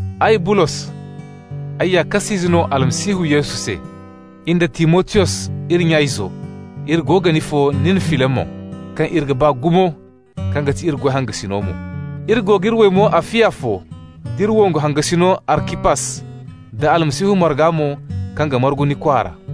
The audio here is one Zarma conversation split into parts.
Ay Bulos, ay ya kas'ize no Almasihu Yesu se. In da Timotiyos, iri nya-izo, iri go ga ni fo, nin Filimon, kaŋ iri ga ba gumo, kaŋ ga ti iri goy hangasino mo. Iri go g'iri waymo Afiya fo, d'iri wongu hangasino Arkipas, da Almasihu marga mo kaŋ ga margu ni kwaara.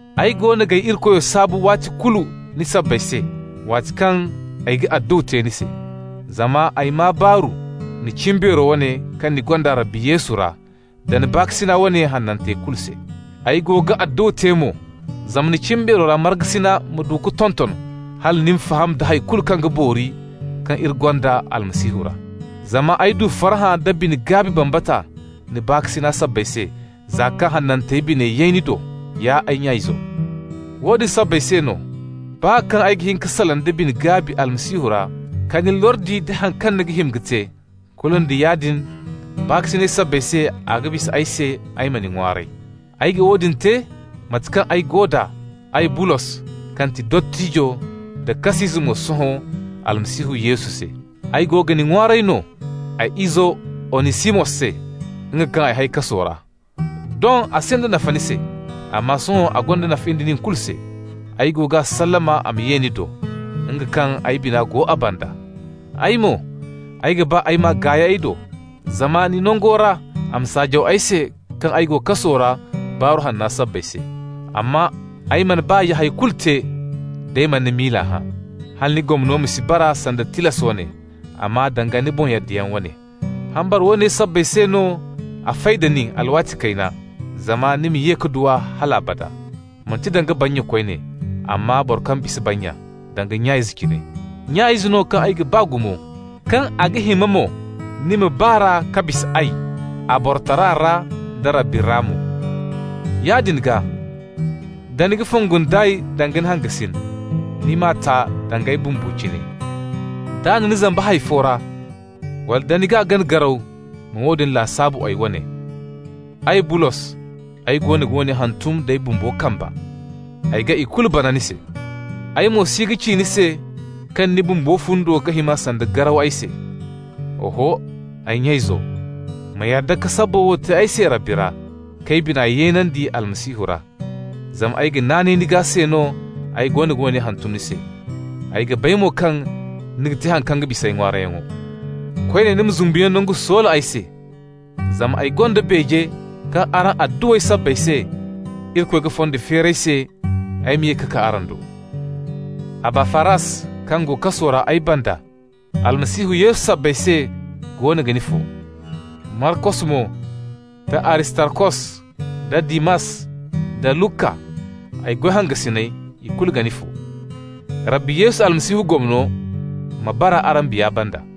Ay goono g'ay Irikoyo saabu waati kulu ni sabbay se, waati kaŋ ay ga adduwa te ni se. Zama ay maa baaru, ni cimbeero wane kaŋ ni gonda Rabbi Yesu ra, da ni baakasina wane hanantey kulu se. Ay go ga adduwa te mo zama ni cimbeero ra markasina ma du ka tonton hala ni ma faham da hay kulu kaŋ ga boori kaŋ iri gonda Almasihu ra. Zama ay du farhã da bine-gaabi bambata ni baakasina sabbay se, za kaŋ hanantey biney yay ni do, ya ay nya-izo. Woodin sabbay se no, baa kaŋ ay ga hin ka salaŋ da bine-gaabi Almasihu ra ka ni lordi nda haŋ kaŋ ni ga hima ka te, kulu nda yaadin baakasinay sabbay se a ga bisa ay se ay ma ni ŋwaaray. Ay ga woodin te, mate kaŋ ay go d'a, ay Bulos, kaŋ ti dottijo, da kas'ize mo sohõ Almasihu Yesu se. Ay go ga ni ŋwaaray no, ay izo Onisimos se, nga kaŋ ay hay kaso ra. Doŋ a sinda nafa ni se, amma sohõ a gonda nafa in da nin kulu se. Ay goono g'a sallama a ma ye ni do, nga kaŋ ay bina go a banda. Ay mo, ay ga ba ay m'a gaay ay do, zama ni nango ra a ma saajaw ay se kaŋ ay go kaso ra Baaru Hanna sabbay se. Amma ay mana ba ya hay kulu te d'ay mana ni miila hã, hala ni gomno ma si bara sanda tilas wane, amma danga ni boŋ yaddayaŋ wane. Hambara woone sabbay se no a fay da nin alwaati kayna, zama ni ma ye ka du a hal abada, manti danga bannya koyne, amma boro kaŋ bisa bannya, danga nya-ize cine. Nya-ize no kaŋ ay ga ba gumo, kaŋ a ga hima mo ni ma ba r'a ka bisa ay a borotara ra da Rabbi ra mo. Yaadin gaa, da ni ga fongu nd'ay danga ni hangasin, ni m'a ta danga ay bumbo cine. D'a na ni zamba hay fo ra, wala nda ni g'a gana garaw, ma woodin lasaabu ay wane. Ay Bulos, ay goono ga woone hantum d'ay bumbo kamba: ay ga ikulu bana ni se. Ay mo si ga ci ni se kaŋ ni bumbo fundo ga hima sanda garaw ay se. Oho, ay nya-izo, ma yadda ka sabbo wo te ay se Rabbi ra, k'ay bina yeenandi Almasihu ra. Zama ay ga naanay ni gaa se no, ay goono ga woone hantum ni se, ay ga bay mo kaŋ ni ga te haŋ kaŋ ga bisa ay ŋwaarayyaŋo. Koyne ni ma zumbuyaŋ nangu soola ay se, zama ay gonda beeje kaŋ araŋ adduwey sabbay se Irikoy ga fondo feeri ay se ay ma ye ka kaa araŋ do. Abafaras kaŋ go kaso ra ay banda Almasihu Yesu sabbay se goono ga ni fo. Markos mo, da Aristarkos, da Dimas, da Luka, ay goy hangasiney, ikulu ga ni fo. Rabbi Yesu Almasihu gomno ma bara araŋ biya banda.